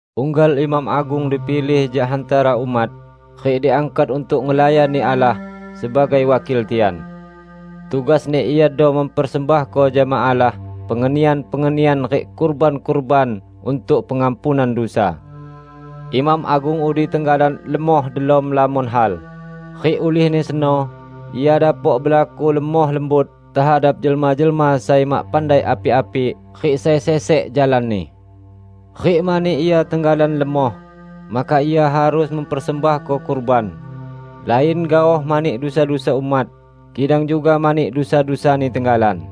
Unggal imam agung dipilih jak hantara umat, rik diangkat untuk ngelayani Allah sebagai wakil tian. Tugasni iado mempersembahko jama Allah pengenian-pengenian rik kurban-kurban untuk pengampunan dusa. Imam agung udi tenggalan lemoh delom lamon hal, rik ulihni seno ia dapok belaku lemoh lembut tehadap jelma-jelma sai mak pandai api-api rik sai sesek jalanni. Rik mani ia tenggalan lemoh, maka ia harus mempersembahko kurban, lain gaoh mani dusa-dusa umat, kidang juga mani dusa-dusani tenggalan.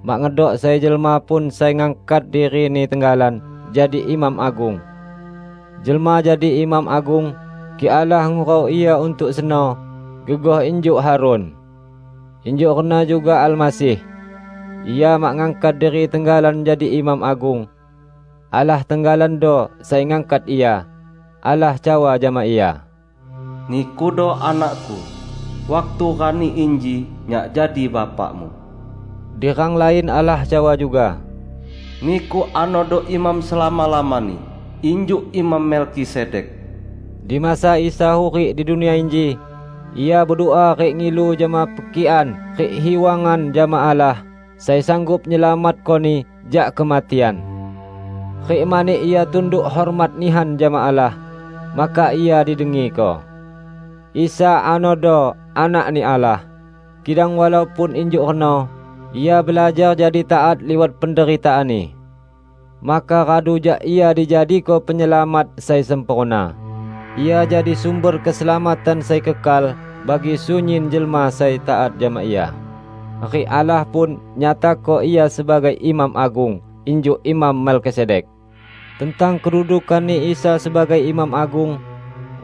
Mak ngedok sai jelma pun sai ngangkat dirini tenggalan jadi imam agung. Jelma jadi imam agung, kik Allah ngurau ia untuk seno -- gegoh injuk Harun. Injuk reno juga Almasih. Ia mak ngangkat diri tenggalan jadi Imam Agung. Allah tenggalando sai ngangkat Ia. Allah cawa jama Ia, "Nikudo Anak-Ku; waktu rani inji Nyak jadi Bapa-Mu." Di rang lain Allah cawa juga, "Niku anodo Imam selama-lamani, injuk Imam Melkisedek." Di Masa Isa hurik di dunia inji, Ia bedua rik ngilu jama pekikan rik hiwangan jama Allah, sai sanggup nyelamatkoni jak kematian. Rik mani Ia tunduk hormat nihan jama Allah, maka Ia didengiko. Isa anodo Anak-Ni Allah, kidang walaupun injuk reno, Ia belajar jadi taat liwat penderitaan-Ni. Maka radu jak Ia dijadiko Penyelamat sai sempurna, Ia jadi sumber keselamatan sai kekal bagi sunyin jelma sai taat jama Ia, rik Allah pun, nyatako Ia sebagai Imam Agung, injuk Imam Melkisedek! Tentang kedudukan-Ni Isa sebagai Imam Agung,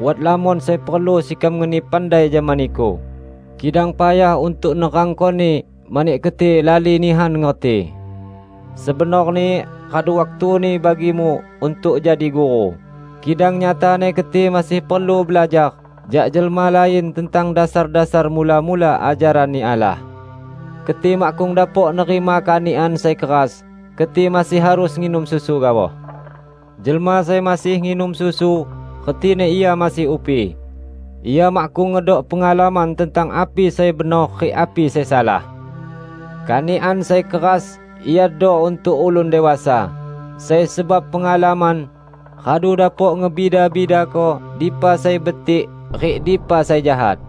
wat lamon sai perlu sekam ngeni pandai jama niku, kidang payah untuk nerangkoni mani keti lali nihan ngerti. Sebenorni radu waktuni bagimu untuk jadi guru, kidang nyatani keti masih perlu belajar jak jelma lain tentang dasar-dasar mula-mula ajaran-Ni Allah. Keti makkung dapok nerima kanikan sai keras; keti masih harus nginum susu gaoh. Jelma sai masih nginum susu, retini ia masih upi; ia makkung ngedok pengalaman tentang api sai benor rik api sai salah. Kanikan sai keras iado untuk ulun dewasa sai sebab pengalaman, radu dapok ngebida-bidako dipa sai betik rik dipa sai jahat.